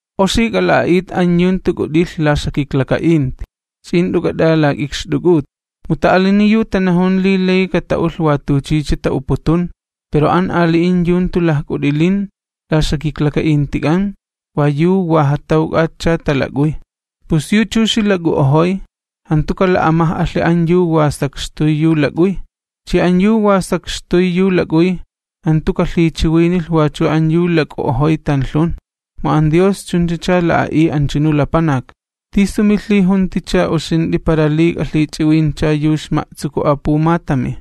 Oxi k'ala'a'it an yu jantu k'ut'ilh la ixjakiklaka'inti, ch'i jant'u k'at'alak'ikxt'uk'ut. Mu ta'alini yu tanajun li layi kata'ulh wa tuchicha ta'uputun, pero an ali'in yu jantu lajk'ut'ilin la ixjakiklaka'intik'an wa yu wa jatawk'atcha talak'uy. Pus yu chuxi lak'u'ojoy, jantu kala'amaj'alhi an yu wa sakxtuy yu lak'uy, chi an yu wa sakxtuy yu lak'uy, jantu kalhichiwinilh wachu an yu lak'u'ojoy tanlhun, mu an Dios chunchacha la'a'iy anchunu lapanak. ¿Tisu milhijunticha uxint'i para li k'alhich'iwincha yu ixma'tsuku apumatami?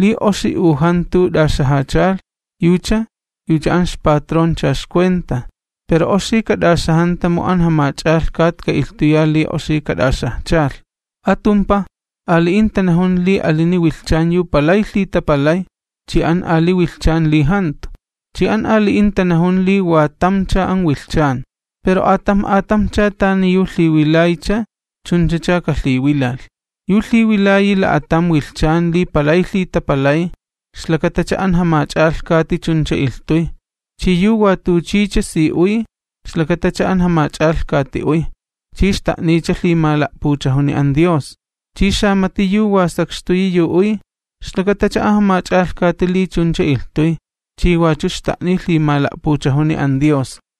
Li oxi u jantu t'axajachalh yucha, yucha an ixpatroncha ixcuenta. Pero oxi kat'axajanta mu an Jamach'alhkat ka'ilhtuya li oxi kat'axajchalh. Atumpaj, ali'in tanajun li alini wilhchan yu palay lhitapalay chi an ali wilhchan li jantu, chi an ali'in tanajun li wa tamcha an wilhchan. Pero atamj atamjcha tani yu lhiwilaycha chunchacha kalhiwilalh. Yu lhiwilayi la'atam wilhchan li palay lhitapalay, ixlakatacha an Jamach'alhkati chuncha ilhtuy. Chi yu wa tuchicha si uy, ixlakatacha an Jamach'alhkati uy, chi xta'niycha lhimala'puchajuni an Dios, chi xamati yu wa sakxtuyi yu uy, ixlakatacha an Jamach'alhkati li chuncha ilhtuy, chi wachu xta'niy lhimala'puchajuni an Dios.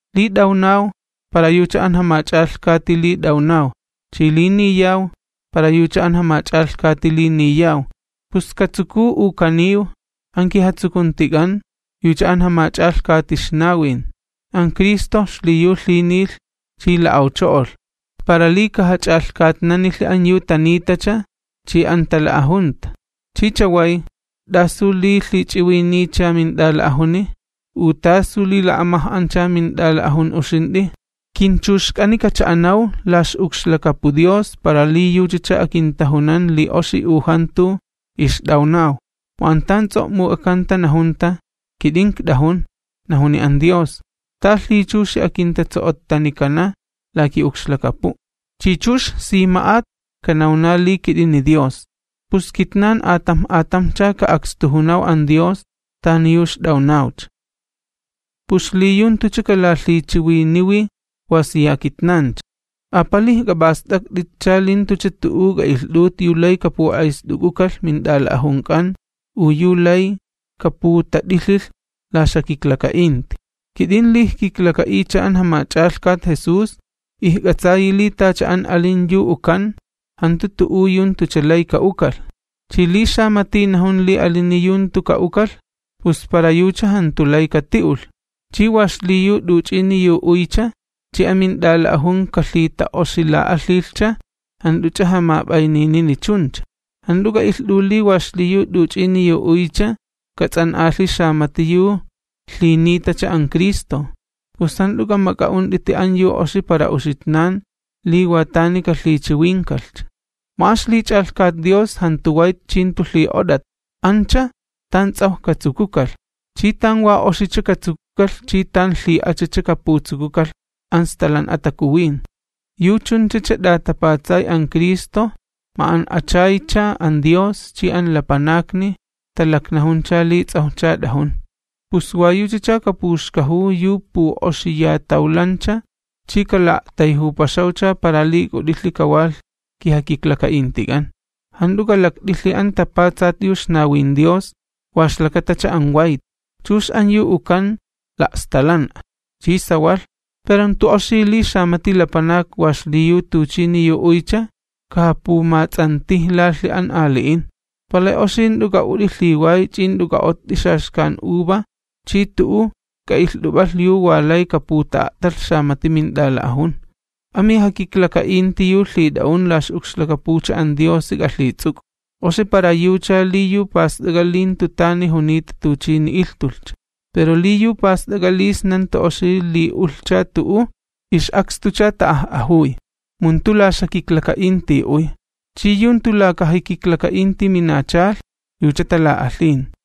Li t'awnaw, para yucha an Jamach'alhkati li t'awnaw, chi li niyaw, para yucha an Jamach'alhkati li niyaw. Pus katsukuw u kaniw, an kijatsukuntik'an yucha an Jamach'alhkati ixnawin. An Cristo xliyu lhinilh chi la'awcho'olh, para li kajach'alhkatnanilhi an yu tanitacha chi an tala'ajunta. ¿Chi chaway, t'asu li lhich'iwiniycha mint'ala'ajuni? ¿U tasu li la'amaj'ancha mint'ala'ajun uxint'i? Kinchuxk'ani kacha'anaw la ix'ukxlakapu Dios para li yuchacha akintajunan li oxi u jantu ixt'awnaw. Mu an tan ts'o'muk'akanta najunta: Kit'in ikt'ajun, najuni an Dios, Ta lhichuxi akintatso'o'ttanikana la ki'ukxlakapu', Chi chux sima'at kanawna li kit'ini Dios. Pus kitnan atamj atamjcha ka'akstujunaw an Dios tani yu ixt'awnawcha. Pus xliyu jantucha kalalhichiwiniwi wa siya kitnancha, apalij k'ap'ast'akt'itcha li jantucha tu'u k'a'ilht'ut yu lay kapu'ayst'uk'ukalh mint'ala'ajunk'an u yu lay kaputat'ilhilh la ixjakiklaka'inti. Kit'in li ijkiklaka'iycha an Jamach'alhkat Jesús, ijk'atsayi li tacha an alin yu ukan, jantu tu'u yu tucha lay ka'ukalh. Chi li xamati najun li alini yu jantu ka'ukalh, pus para yucha jantu lay kati'ulh. Chi wa xliyu t'uch'ini yu uycha, chi amint'ala'ajun kalhita'oxila'alhilhcha, jant'uch'a jamap'ayninini chuncha. Jant'u k'a'ilht'u li wa xliyu t'uch'ini yu uycha kats'an'alhi xamati yu lhinitacha an Cristo. Pus jant'u k'amak'a'unt'iti an yu oxi para uxitnan li wa tani kalhichiwinkalhcha. Mu an ixlich'alhkat Dios jantu wayt chi jantu lhi'ot'at, ancha, tan ts'awj katsukukalh, chi tan wa oxicha katsukukalh chi tan lhi'achacha kaputsukukalh an Stalan'a Takuwin. Yu chunchacha t'atapatsay an Cristo ma'an'achaycha an Dios chi an lapanakni talaknajuncha li ts'awjcha t'ajun. Pus wa yuchacha kapuxkajuw yu pu'oxiyatawlancha chi kala'a'tayjupaxawcha para li k'ut'ilhi kawalh kijakiklaka'intik'an. Jant'u k'alakt'ilhi an tapatsat yu ixnawin Dios wa ixlakatacha an wayt. Chux an yu ukan la'stalan'a, chi sawalh. Pero jantu oxi li xamati lapanak wa xliyu tuchini yu uycha, kajapumats'antijlalhi an ali'in. Palay oxi jant'u k'a'ut'i lhiway ch'i jant'u k'a'ott'i xaxkan uva chi tu'u k'a'ilht'up'alh yu wa lay kaputa'a'talh xamati mint'ala'ajun. Amijakiklaka'inti yu lhit'a'un la ix'ukxlakapucha an Diosi k'alhits'uk'u. Oxi para yucha li yu past'ak'a li jantu tani junita tuchini ilhtulhcha. Pero li yu past'ak'a li sna jantu oxi li ulhcha tu'u, ix'akstucha ta'aj'ajuy, mu jantu la ixjakiklaka'inti uy. Chi yu jantu lakajakiklaka'inti minachalh, yucha tala'alhin.